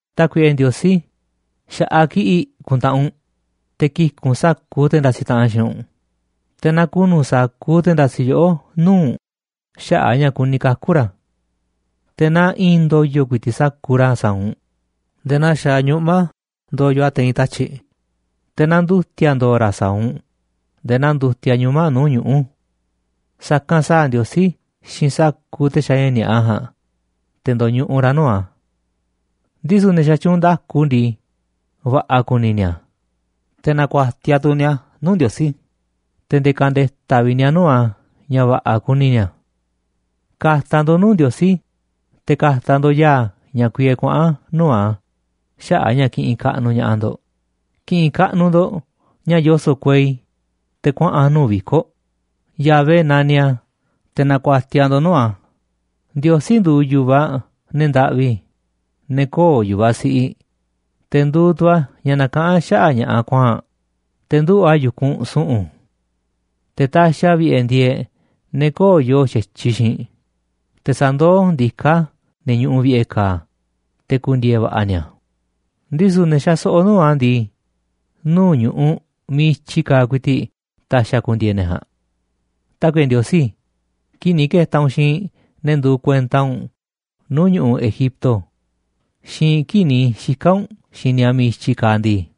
Tákuiꞌe Ndiosí, xa̱ꞌaꞌ kiꞌi̱ꞌ ku̱ntaꞌanꞌ u̱nꞌ, te̱ ki̱ku̱ꞌ u̱nꞌ sa̱kuuꞌ te̱ ndasiꞌ taꞌanꞌ xiinꞌ u̱nꞌ, te̱ na ku̱nu̱ sa̱kuuꞌ te̱ ndasiꞌ yoꞌó nuu̱ꞌ u̱nꞌ xaꞌa̱ꞌ a̱ ña̱ kuni kaku̱ ra̱. Te̱ na i̱i̱n ndo̱yo̱ ku̱i̱ti̱ꞌ sa̱kuuꞌ ra̱ sa̱a̱ u̱nꞌ nde̱e̱ naa xaaꞌ ñuꞌma̱ ndoyoꞌ a̱ te̱i̱n tatyi̱ꞌ, te̱ na ndu̱ti̱a̱ ndo̱o̱ ra̱ sa̱a̱ u̱nꞌ nde̱e̱ na ndutiaꞌ ñuma̱ꞌ nuu̱ꞌ ñuꞌu̱. Sa̱kanꞌ sa̱a̱ Ndiosí xiinꞌ sa̱kuuꞌ te̱ xaaꞌ ña̱ ni̱a̱ꞌa ja̱a̱nꞌ, te̱ ndo̱ñuꞌuꞌ ra̱ nuu̱ꞌ a̱. Ndisu̱ ne̱ xatyuunꞌ nda̱ku ndii, va̱ꞌa̱ ku̱ni̱ ni̱a̱, te̱ na̱ku̱a̱tiaꞌ tu̱ ni̱a̱ nuu̱ꞌ Ndiosí, te̱ nde̱e̱ ka̱nde̱ta̱ vi̱ꞌ ni̱a̱ nuu̱ꞌ a̱ ña̱ va̱ꞌa̱ kuni ni̱a̱. Ka̱ta̱ ndo̱ꞌ nuu̱ꞌ Ndiosí, te̱ ka̱ta̱ ndo̱ꞌ ya̱a̱ ña̱ kuiee kuaꞌa̱n nuu̱ꞌ a̱ xaꞌa̱ꞌ a̱ ña̱ kiꞌinꞌ kaꞌnuꞌ ña̱ꞌaꞌ ndo̱ꞌ, ki̱ꞌi̱n kaꞌnuꞌ ndo̱ꞌ ña̱ yoso̱ꞌ kuei te̱ kuaꞌa̱n a̱ nuu̱ꞌ viko̱ꞌ, Yahvé naniꞌ a̱, te̱ na̱ku̱a̱tiaꞌ ndo̱ꞌ nuu̱ꞌ a̱. Ndiosí nduuꞌ yu̱vaꞌ ne̱ ndaꞌvi, ne̱ köo̱ꞌ yu̱vaꞌ siꞌiꞌ, te̱ nduuꞌ tu̱ a̱ ña̱ nakaꞌán xaꞌa̱ꞌ ña̱ꞌaꞌ kuaa̱nꞌ, te̱ nduꞌu̱ꞌ a̱ yu̱kunꞌ su̱ꞌu̱n. Te̱ taxiꞌ a̱ vi̱ꞌe̱ ndieeꞌ ne̱ köo̱ꞌ yoo xa̱tyiꞌ xiinꞌ, te̱ sandoó ndiká a̱ ne̱ ñuꞌuꞌ vi̱ꞌe̱ ka̱a̱, te̱ ku̱ndi̱e̱e̱ va̱ꞌa̱ ni̱a̱, ndisu̱ ne̱ xaso̱ꞌo̱ nuu̱ꞌ a̱ ndii, nuu̱ꞌ ñu̱ꞌuꞌ miiꞌ i̱tyi kaaꞌ ku̱i̱ti̱ꞌ ta̱xi̱ a̱ ku̱ndi̱e̱e̱ ne̱ ja̱a̱nꞌ. Tákuiꞌe Ndiosí, kii̱ꞌ ni̱ ke̱ta̱ u̱nꞌ xiinꞌ ne̱ nduuꞌ kuenta u̱nꞌ nuu̱ꞌ ñu̱ꞌuꞌ Egipto, xiinꞌ kii̱ꞌ ni̱ xika̱ u̱nꞌ xiinꞌ ni̱a̱ miiꞌ i̱tyi kaaꞌ ndii,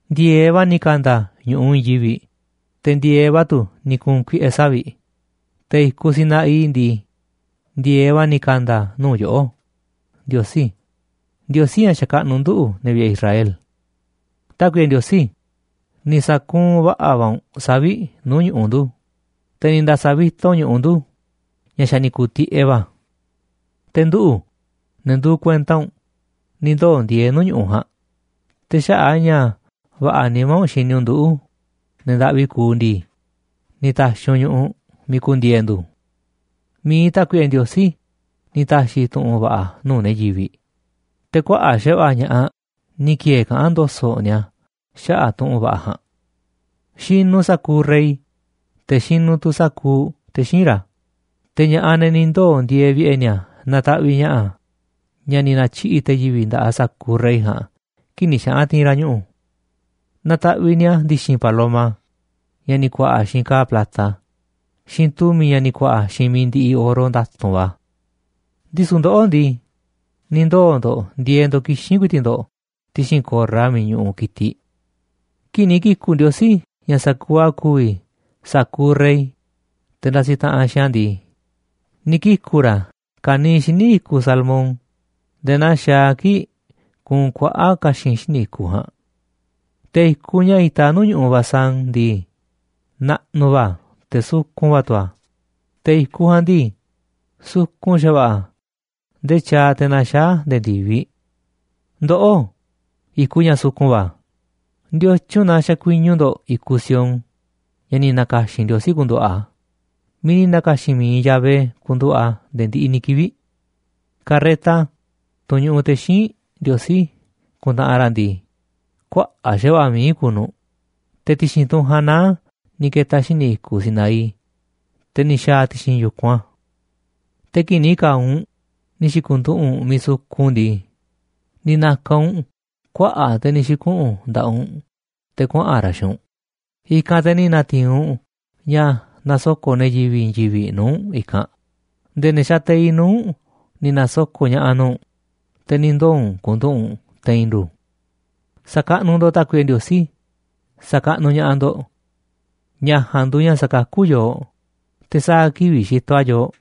ndi̱e̱eꞌ va̱ ni̱ ka̱nda̱ ñu̱ꞌuꞌ i̱i̱n yivi̱ꞌ, te̱ ndi̱e̱eꞌ va̱ tu̱ ni̱ ku̱u̱n kuiꞌe̱ savi̱ꞌ, te̱ i̱kuꞌ Sinaí ndii, ndi̱e̱eꞌ va̱ ni̱ ka̱nda̱ a̱ nuu̱ꞌ yoꞌó, Ndiosí, Ndiosí ña̱ xakaꞌnuꞌ nduꞌu̱, ne̱ vi̱ꞌe̱ Israel. Tákuiꞌe Ndiosí, ni̱ sa̱kuunꞌ va̱ꞌa̱ va̱ u̱nꞌ savi̱ꞌ nuu̱ꞌ ñu̱ꞌuꞌ ndu̱, te̱ ni̱ nda̱sa̱ vi̱ta u̱nꞌ ñu̱ꞌuꞌ ndu̱ ña̱ xa̱ ni̱ ku̱u̱ tiꞌeꞌ va̱. Te̱ nduꞌu̱, ne̱ nduuꞌ kuenta u̱nꞌ, ni̱ ndoo̱ ndieeꞌ nuu̱ꞌ ñu̱ꞌuꞌ ja̱a̱nꞌ, te̱ xaꞌa̱ꞌ a̱ ña̱ va̱ꞌa̱ nimá u̱nꞌ xini u̱nꞌ nduꞌu̱ꞌ, ne̱ ndaꞌvi kuuꞌ ndii, ni̱ ta̱xi̱ u̱nꞌ ñu̱ꞌuꞌ miiꞌ ku̱ndi̱e̱e̱ ndu̱. Mi̱iꞌ Tákuiꞌe Ndiosí ni̱ ta̱xi̱ tu̱ꞌu̱n va̱ꞌa̱ nuu̱ꞌ ne̱ yivi̱ꞌ, te̱ kuaꞌa̱ꞌ xa̱va̱ꞌa̱ ña̱ꞌaꞌ ni̱ ki̱e̱e̱ kaꞌán ndo̱so̱ꞌ ni̱a̱ xaꞌa̱ꞌ tu̱ꞌu̱n va̱ꞌa̱ ja̱a̱nꞌ. Xinuꞌ sa̱kuuꞌ Rey, te̱ xinuꞌ tu̱ sa̱kuuꞌ te̱ xíinꞌ ra̱, te̱ ña̱ꞌaꞌ, ne̱ ni̱ ndoo̱ ndieeꞌ vi̱ꞌe̱ ni̱a̱, nataꞌviꞌ ña̱ꞌa̱ ña̱ ni̱ na̱tyiꞌi̱ꞌ te̱ yivi̱ꞌ nda̱ꞌaꞌ sa̱kuuꞌ rey ja̱a̱nꞌ kii̱ꞌ ni̱ xaꞌa̱n ti̱i̱n ra̱ ñuꞌu̱. Nataꞌviꞌ ni̱a̱ ndi̱xi̱n paloma, ña̱ ni̱ ku̱a̱ꞌa̱ xiinꞌ ka̱a̱ plata, xiinꞌ tu̱mi̱, ña̱ ni̱ ku̱a̱ꞌa̱ xiinꞌ mi̱iꞌ ndiꞌiꞌ oro nda̱tu̱nꞌ va̱. Ndisu̱ ndoꞌó ndii, ni̱ ndoo̱ ndo̱ꞌ ndieeꞌ ndo̱ꞌ kixín ku̱i̱ti̱ꞌ ndo̱ꞌ ti̱xi̱n ko̱rra miiꞌ ñuꞌuꞌ ki̱tiꞌ. Kii̱ꞌ ni̱ ki̱ku̱ꞌ Ndiosí ña̱ sa̱kuuꞌ a̱ ku̱vi̱ sa̱kuuꞌ rey, te̱ ndasiꞌ taꞌanꞌ xiinꞌ a̱ ndii, ni̱ kiku̱ ra̱ ka̱niiꞌ xíniꞌ i̱kuꞌ Salmón nde̱e̱ naa xaaꞌ a̱ kii̱ꞌ kuunꞌ kuaꞌa̱ꞌ ka̱xi̱n xíniꞌ i̱kuꞌ ja̱a̱nꞌ. Te̱ i̱kuꞌ ña̱ itaꞌ nuu̱ꞌ ñu̱ꞌuꞌ Basán ndii, naꞌnuꞌ va̱ a̱ te̱ sukun va̱ tu̱ a̱, te̱ i̱kuꞌ ja̱a̱nꞌ ndii, sukun xa̱va̱ꞌa̱ a̱ ndee tyaaꞌ te̱ na̱xaa̱ a̱ nde̱e̱ ndi̱viꞌ. Ndoꞌó, i̱kuꞌ ña̱ sukun va̱, ¿ndiotyun na xakuiñu ndo̱ꞌ i̱kuꞌ Sión, ña̱ ni̱ na̱ka̱xi̱n Ndiosí ku̱nduꞌu̱ꞌ a̱, miiꞌ ni̱ na̱ka̱xi̱n mi̱iꞌ Yahvé ku̱nduꞌu̱ꞌ a̱ nde̱e̱ ndiꞌiꞌ ni̱ kivi̱ꞌ? Karreta, tunꞌ ñuꞌuꞌ te̱ xíinꞌ Ndiosí kuntaꞌanꞌ ra̱ ndii, kuaꞌa̱ꞌ xa̱va̱ꞌa̱ mií kuuꞌ nu̱ꞌ, te̱ ti̱xi̱n tunꞌ ja̱a̱nꞌ naá a̱ ni̱ ke̱ta̱ a̱ xíniꞌ i̱kuꞌ Sinaí, te̱ ni̱ xa̱a̱ a̱ ti̱xi̱n yu̱kunꞌ a̱. Te̱ kii̱ꞌ ni̱ ka̱a̱ u̱nꞌ ni̱ xi̱ku̱nduꞌu̱ꞌ u̱nꞌ miiꞌ sukun ndii, ni̱ na̱ka̱ u̱nꞌ kuaꞌa̱ꞌ te̱ ni̱ xi̱kuꞌu̱n nda̱ꞌaꞌ u̱nꞌ u̱n te̱ kuaꞌa̱n ra̱ xiinꞌ u̱nꞌ, i̱kanꞌ te̱ ni̱ na̱ti̱i̱n u̱nꞌ ña̱ nasoko̱ꞌ ne̱ yivi̱ꞌ i̱i̱n yivi̱ꞌ nuu̱ꞌ u̱nꞌ i̱kanꞌ, nde̱e̱ ne̱ xateiꞌ nuu̱ꞌ u̱nꞌ ni̱ na̱soko̱ꞌ ña̱ꞌa̱ nuu̱ꞌ u̱nꞌ, te̱ ni̱ ndoo̱ u̱nꞌ ku̱nduꞌu̱ꞌ u̱nꞌ te̱i̱n ndu̱. Sa̱kaꞌnuꞌ ndo̱ꞌ Tákuiꞌe Ndiosí, sa̱kaꞌnuꞌ ña̱ꞌaꞌ ndo̱ꞌ. Ña̱ ja̱a̱nꞌ nduuꞌ ña̱ sakakú yooꞌ, te̱ sa̱a̱ kivi̱ꞌ xitoꞌ a̱ yooꞌ.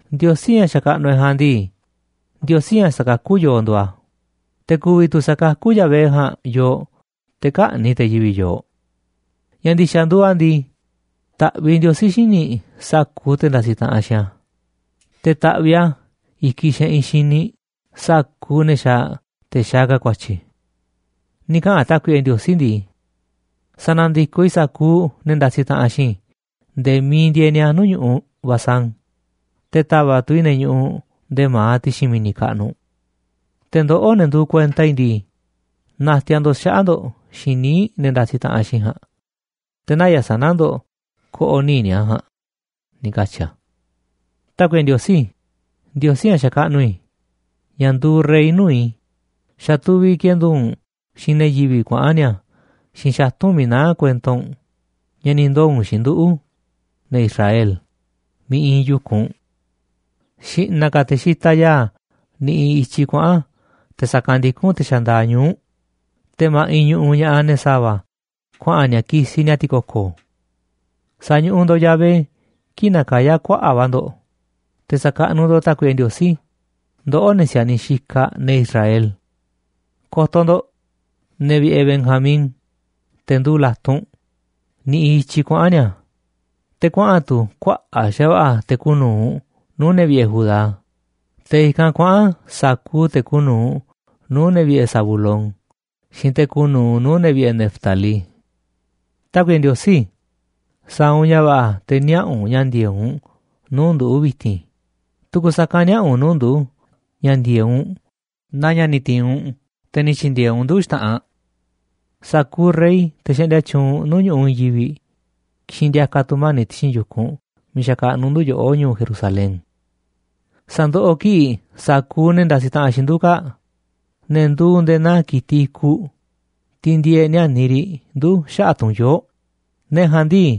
Ndiosí, ña̱ xakaꞌnuꞌ e̱ꞌ ja̱a̱nꞌ ndii, Ndiosí ña̱ sakakú yooꞌ nduuꞌ a̱, te̱ ku̱vi̱ tu̱ sa̱kakú Yahvé ja̱a̱nꞌ yooꞌ te̱ kä̱ꞌni̱ꞌ te̱ yivi̱ꞌ yooꞌ. Ña̱ ndi̱xa̱ nduuꞌ a̱ ndii, ta̱ꞌviꞌ Ndiosí xíniꞌ sa̱kuuꞌ te̱ ndasiꞌ taꞌanꞌ xiinꞌ a̱, te̱ ta̱ꞌviꞌ a̱ i̱kiꞌ xe̱ꞌi̱n xíniꞌ sa̱kuuꞌ ne̱ xaaꞌ te̱ xaaꞌ ka̱ ku̱a̱tyi̱. Ni̱ kaꞌa̱n Tákuiꞌe Ndiosí ndii: “Sa̱na̱ndikoꞌ i̱ sa̱kuuꞌ ne̱ ndasiꞌ taꞌanꞌ xiinꞌ i̱ nde̱e̱ miiꞌ ndieeꞌ ni̱a̱ nuu̱ꞌ ñu̱ꞌuꞌ Basán, te̱ ta̱va̱ꞌ tu̱ i̱ ne̱ ñuꞌuꞌ nde̱e̱ ma̱aꞌ ti̱xi̱n mi̱ni̱ kaꞌnuꞌ. Te̱ ndoꞌó, ne̱ nduuꞌ kuenta i̱ ndii, na̱ti̱a̱ ndo̱ꞌ xaꞌa̱ꞌ ndo̱ꞌ xiinꞌ níiꞌ ne̱ ndasiꞌ taꞌanꞌ xiinꞌ i̱ ja̱a̱nꞌ, te̱ naya̱ꞌ sana̱ ndo̱ꞌ ko̱ꞌo̱ níiꞌ ni̱a̱ ja̱a̱nꞌ”, ni̱ katyi̱ a̱. Tákuiꞌe Ndiosí, Ndiosí ña̱ xakaꞌnuꞌ i̱, ña̱ nduuꞌ rey nuu̱ꞌ i̱, xa̱ tuviꞌ kendu̱u̱ u̱nꞌ xiinꞌ ne̱ yivi̱ꞌ kuaꞌa̱n ni̱a̱ xiinꞌ xatu̱nꞌ miiꞌ naá kuento u̱nꞌ ña̱ ni̱ ndoo̱ u̱nꞌ xiinꞌ nduꞌu̱, ne̱ Israel, miiꞌ iinꞌ yu̱kunꞌ u̱nꞌ. Xi̱ꞌna̱ ka̱ te̱ xitaꞌ ya̱a̱ niꞌiꞌ i̱tyiꞌ kuaꞌa̱n te̱ sa̱kanꞌ ndikún te̱ xandaaꞌ ñuu̱ꞌ, te̱ ma̱ꞌiꞌ ñuꞌuꞌ ña̱ꞌaꞌ ne̱ sa̱va̱ kuaꞌa̱n ni̱a̱ kisiꞌ ni̱a̱ ti̱ko̱ko̱. Sa̱ñuꞌuꞌ ndo̱ꞌ Yahvé kii̱ꞌ nakayá kuaꞌa̱ꞌ va̱ ndo̱ꞌ, te̱ sa̱kaꞌnuꞌ ndo̱ꞌ Tákuiꞌe Ndiosí, ndoꞌó, ne̱ si̱a̱niꞌ xikaꞌ ne̱ Israel. Ko̱to̱ ndo̱ꞌ, ne̱ vi̱ꞌe̱ Benjamín, te̱ nduuꞌ la̱tunꞌ, niꞌiꞌ i̱tyiꞌ kuaꞌa̱n ni̱a̱, te̱ kuaꞌa̱n tu̱ kuaꞌa̱ꞌ xa̱va̱ꞌa̱ te̱ kuuꞌ nu̱uꞌ nuu̱ꞌ ne̱ vi̱ꞌe̱ Judá, te̱ i̱kanꞌ kuaꞌa̱n sa̱kuuꞌ te̱ kuuꞌ nu̱uꞌ nuu̱ꞌ ne̱ vi̱ꞌe̱ Zabulón xiinꞌ te̱ kuuꞌ nu̱uꞌ nuu̱ꞌ ne̱ vi̱ꞌe̱ Neftalí. Tákuiꞌe Ndiosí, sa̱a̱ u̱nꞌ ña̱ va̱ꞌa̱ te̱ niaꞌa̱ u̱nꞌ ña̱ ndi̱e̱eꞌ u̱nꞌ nuu̱ꞌ ndu̱ vi̱ti̱n, tu̱ku̱ sa̱kanꞌ niaꞌa̱ u̱nꞌ nuu̱ꞌ ndu̱ ña̱ ndi̱e̱eꞌ u̱nꞌ naa ña̱ ni̱ ti̱i̱n u̱nꞌ te̱ ni̱ tyi̱ndi̱e̱eꞌ u̱nꞌ ndu̱ xta̱ꞌanꞌ. Sa̱kuuꞌ rey, te̱ xaꞌndia tyuunꞌ nuu̱ꞌ ñu̱ꞌuꞌ i̱i̱n yivi̱ꞌ, ki̱xi̱n ndi̱a̱ka̱ tu̱mani̱ꞌ ti̱xi̱n yu̱kunꞌ miiꞌ xakaꞌnuꞌ ndu̱ yoꞌó ñu̱u̱ Jerusalén. Sa̱ndoꞌoꞌ kiꞌi̱ꞌ sa̱kuuꞌ ne̱ ndasiꞌ taꞌanꞌ xiinꞌ ndu̱ kaa̱ꞌ, ne̱ nduuꞌ nde̱e̱ naa ki̱tiꞌ i̱kuꞌ, tiꞌ ndieeꞌ níániꞌ riꞌ ndu̱ xaꞌa̱ꞌ tu̱nyoo̱ꞌ, ne̱ ja̱a̱nꞌ ndii,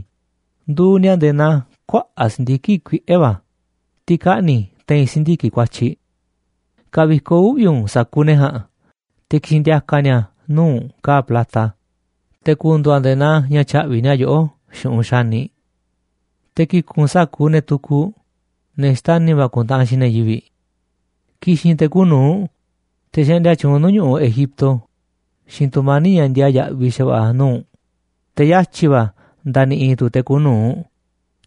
nduuꞌ ni̱a̱ nde̱e̱ naa kuaꞌa̱ꞌ si̱ndiki̱ꞌ kuiꞌe̱ va̱, tiꞌ kaꞌni̱ te̱i̱n si̱ndiki̱ꞌ kuatyiꞌ. Ka̱vikoꞌ uꞌvi̱ u̱nꞌ sa̱kuuꞌ ne̱ ja̱a̱nꞌ te̱ ki̱xi̱n ndi̱a̱ka̱ ni̱a̱ nuu̱ꞌ u̱nꞌ ka̱a̱ plata, te̱ ku̱ndu̱u̱ a̱ nde̱e̱ naa ña̱ tya̱ꞌvi̱ ni̱a̱ yoꞌó xu̱ꞌunꞌ xaniꞌ. Te̱ ki̱ku̱n u̱nꞌ sa̱kuuꞌ ne̱ tukuꞌ, ne̱ xtani̱ va̱ ku̱ntaꞌanꞌ xiinꞌ ne̱ yivi̱ꞌ. Ki̱xi̱n te̱ kuuꞌ nu̱uꞌ, te̱ xaꞌndia tyuunꞌ nuu̱ꞌ ñu̱ꞌuꞌ Egipto, xiinꞌ tu̱mani̱ꞌ ña̱ ndiaa yaꞌviꞌ xa̱va̱ꞌa̱ nuu̱ꞌ u̱nꞌ, te̱ yatyi̱ va̱ nda̱ni̱ꞌi̱ tu̱ te̱ kuuꞌ nu̱uꞌ,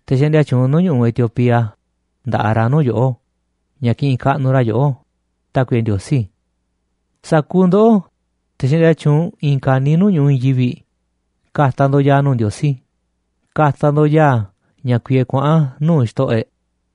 te̱ xaꞌndia tyuunꞌ nuu̱ꞌ ñu̱ꞌuꞌ Etiopía, nda̱ꞌaꞌ ra̱ nuu̱ꞌ yoꞌó ña̱ kiꞌinꞌ kaꞌnuꞌ ra̱ yoꞌó, Tákuiꞌe Ndiosí. Sa̱kuuꞌ ndoꞌó, te̱ xaꞌndia tyuunꞌ i̱i̱n ka̱niiꞌ nuu̱ꞌ ñu̱ꞌuꞌ i̱i̱n yivi̱ꞌ, ka̱ta̱ ndo̱ꞌ ya̱a̱ nuu̱ꞌ Ndiosí, ka̱ta̱ ndo̱ꞌ ya̱a̱ ña̱ kuiee kuaꞌa̱n nuu̱ꞌ xto̱ꞌo̱ e̱ꞌ.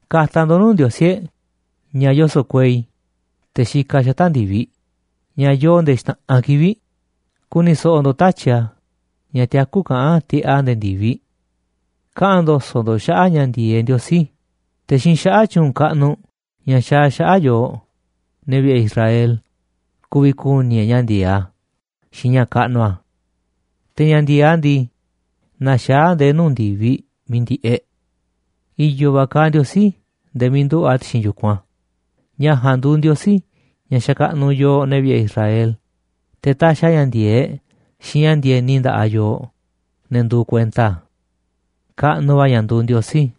Ka̱ta̱ ndo̱ꞌ nuu̱ꞌ Ndiosí e̱ꞌ, ña̱ yoso̱ꞌ kuei, te̱ xikaꞌ a̱ xata̱ꞌ ndi̱viꞌ ña̱ yoo nde̱e̱ xta̱ꞌanꞌ kivi̱ꞌ, ku̱ni̱ so̱ꞌo̱ ndo̱ꞌ tatyi̱ꞌ a̱ ña̱ tiakú kaꞌán tiꞌeꞌ a̱ nde̱e̱ ndi̱viꞌ. Kaꞌa̱n ndo̱so̱ꞌ ndo̱ꞌ xaꞌa̱ꞌ ña̱ ndi̱e̱eꞌ Ndiosí, te̱ xiinꞌ xaꞌa̱ꞌ tyu̱u̱n kaꞌnuꞌ ña̱ xaaꞌ a̱ xaꞌa̱ꞌ yooꞌ, ne̱ vi̱ꞌe̱ Israel, ku̱vi̱ ku̱ni̱ e̱ꞌ ña̱ ndi̱e̱eꞌ a̱ xiinꞌ ña̱ kaꞌnuꞌ a̱. Te̱ ña̱ ndi̱e̱eꞌ a̱ ndii, naxaá a̱ nde̱e̱ nuu̱ꞌ ndi̱viꞌ miiꞌ ndi̱ꞌeꞌ. I̱yo̱ va̱ kaaꞌ Ndiosí nde̱e̱ miiꞌ nduꞌu̱ꞌ a̱ ti̱xi̱n yu̱kunꞌ a̱, ña̱ ja̱a̱nꞌ nduuꞌ Ndiosí, ña̱ xakaꞌnuꞌ yooꞌ, ne̱ vi̱ꞌe̱ Israel, te̱ taxiꞌ a̱ ña̱ ndi̱e̱eꞌ xiinꞌ ña̱ ndi̱e̱ni nda̱ꞌaꞌ yooꞌ, ne̱ nduuꞌ kuenta a̱. Kaꞌnuꞌ va̱ ña̱ nduuꞌ Ndiosí.